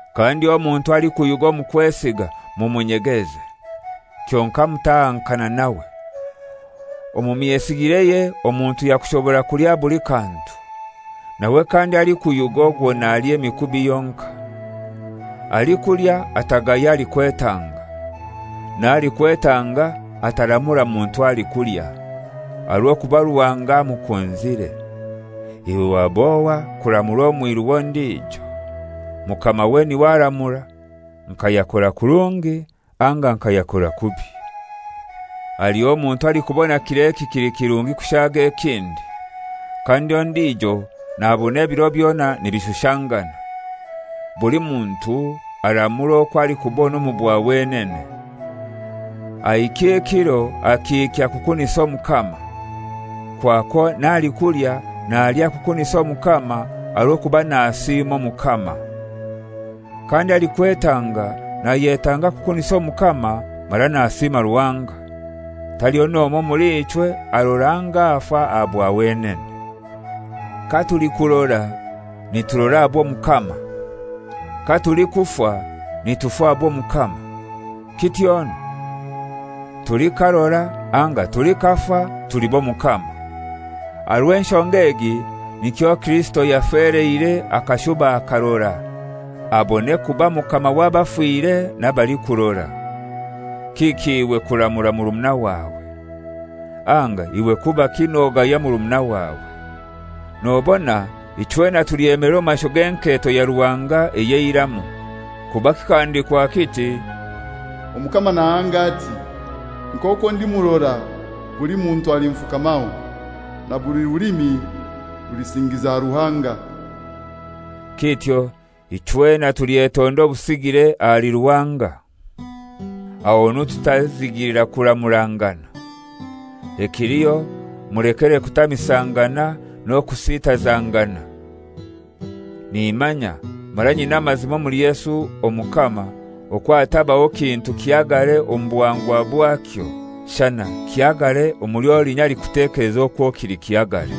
Kandi omuntu alikuyuga omu kwesiga mumunyegeze. Kyonkai mutahankana nawe. Omu myesigireye omuntu yakushobora kulya buli kantu; nawe kandi alikuyuga ogwo nalya emikubi yonkai. Alikulya atagaya alikwetanga. N'alikwetanga ataramura muntu alikulya; aha rw'okuba Ruhanga amukunzire. Iwe wab'ohai kuramura omwiru w'ondijo? Mukamawe n'iwe aramura nka yakora kurungi anga nka yakora kubi. Haliho omuntu alikubona kir'eki kili kirungi kushaaga ekindi, kandi ondijo nabona ebiro byona nibishushangana. Buli muntu aramure okwo alikubona omu bwa wenene. Ahikya ekiro akihikya kukunisa Omukama. Kwakwo n'alikulya nalya kukunisa Omukama, aha rw'okuba nasiima Omukama. Kandi alikwetanga nayetanga kukunisa Omukama mara nasiima Ruhanga. Taliho n'omoi omuli ichwe arora anga afa aha bwa wenene. Katulikurora niturora aha bw'Omukama. Katulikufa nitufa aha bw'Omukama. Kityonu tulikarora anga tulikafa tuli b'Omukama. Aha rw'enshonga egi nikyo Kirisito yafeleire akashuba akarora, abone kuba Mukama w'abafire n'abalikurora. Kiki iwe kuramura murumuna wawe? Anga iwe kubaki nogaya murumuna wawe? Nobona ichwena tulyemelera omu maisho g'enketo ya Ruhanga ey'eiramu; kuba kikahandikwa kiti, «Omukama nahanga ati, Nk'okwo ndi murora, buli muntu alinfukamaho, na buli rulimi rulisingiza Ruhanga.» Kityo ichwena tulyetonda obusigire ahali Ruhanga. Ahonu tutazigilira kuramurangana. Ekiliho mulekere kutamisangana n'okusitazangana. Nimanya mara nyina amazima omuli Yesu Omukama okwo hatabaho kintu kihagare omu buhangwa bwakyo; shana kihagare omuli olinya alikutekeleza okwo kili kihagare.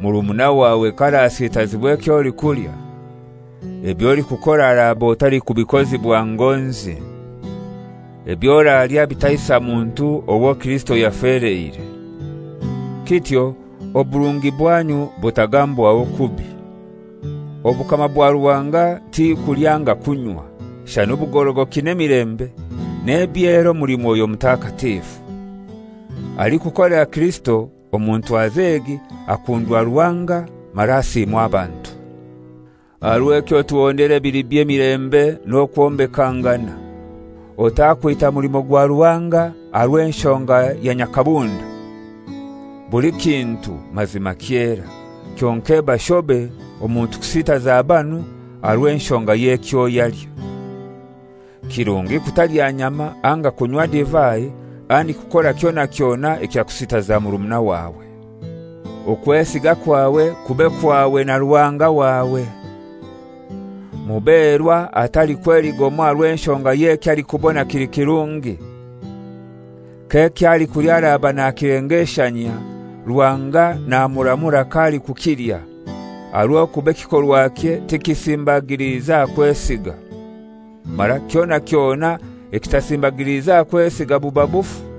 Murumuna wawe k'arasitazibwa eky'olikulya, eby'olikukora oraba otalikubikozibwa ngonzi. Eby'oralya bitaisa muntu owo Kirisito yafeleire. Kityo ekirungo kyanyu kitagambwaho kubi. Obukama bwa Ruhanga ti kulya anga kunywa, shana obugorogoki n'emilembe n'ebyera omuli Mwoyo Mutakatifu. Alikukolera Kirisito omu ntwaza egi akundwa Ruhanga mara asiimwa abantu. Aha rw'ekyo tuhondere ebili by'emilembe n'okwombekangana. Otakwita mulimo gwa Ruhanga aha rw'enshonga ya nyakabunda. Buli kintu mazima kyera, kyonkai eba shobe omuntu kusitaza banu aha rw'enshonga y'ekyo yalya. Kirungi kutalya nyama anga kunywa divai, handiki kukora kyona kyona ekyakusitaza murumuna wawe. Okwesiga kwawe kube kwawe na Ruhanga wawe. Muberwa atalikweligomwa aha rw'enshonga y'ekyo alikubona kili kirungi. K'eky'alikulya araba nakilengeshanyia, Ruhanga namuramura k'alikukilya, aha rw'okuba ekikorwakye tikisimbagiliize aha kwesiga. Mara kyona kyona ekitasimbagiliize aha kwesiga buba bufu.